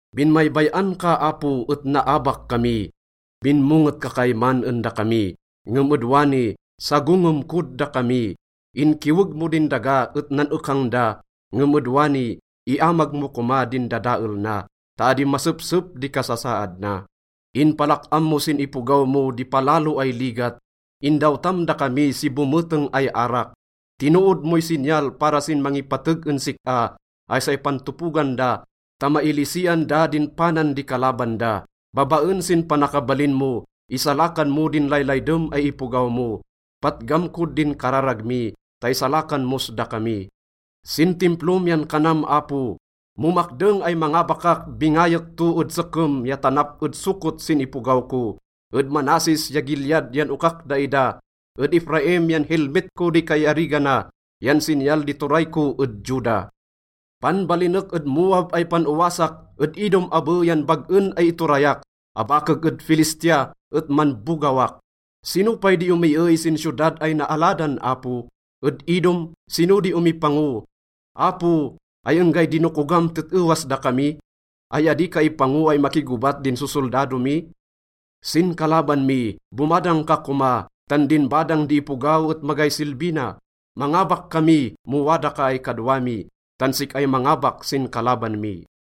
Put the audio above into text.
Binmaybay-an ka, Apo, et naabak kami. Binmonget ka kayman en dakami, ngem ed wani, sagongem kod dakami. Inkiweg mo din daga et nan-ekang da, ngem ed wani, iamag mo koma din dadael na ta adi masepsep di kasasaad na. Inpalak-am mo sin ipogaw mo di palalo ay ligat. Indawtam dakami si bometeng ay arak. Tinood moy sinyal para sin mangipateg en sik-a ay say pantopogan da ta mailisian da din panan di kalaban da. Babaen sin panakabalin mo, isalakan mo din laylaydem ay ipogaw mo. Patgam kod din kararag mi ta isalakan mos dakami. Sin Timplom yan kanam, Apo, “Mo makdeng ay mangabakak, bingayek to ed Sekem ya tanap ed Succot sin ipogaw ko. Ed Manasses ya Gilead yan okak daida, ed Efraim yan helmet ko di kaiarigana yan sinyal di turay ko ed Juda. Panbalinek ed Moab ay pan-owasak, ed Edom abe yan bag-en ay iturayak. Abakek ed Filistia et manbogawak.” Sino pay di omiey sin siyodad ay naaladan, Apo? Ed Edom, sino di omipango? Apo, ay enggay dinokogam tet-ewas dakami? Ay adi ka ipango ay makigobat din sosoldado mi? Sin kalaban mi, bomadang ka koma, tan din badang di ipogaw et magay silbi na. Mangabak kami mo wada ka ay kadwa mi, tan sik-ay mangabak sin kalaban mi.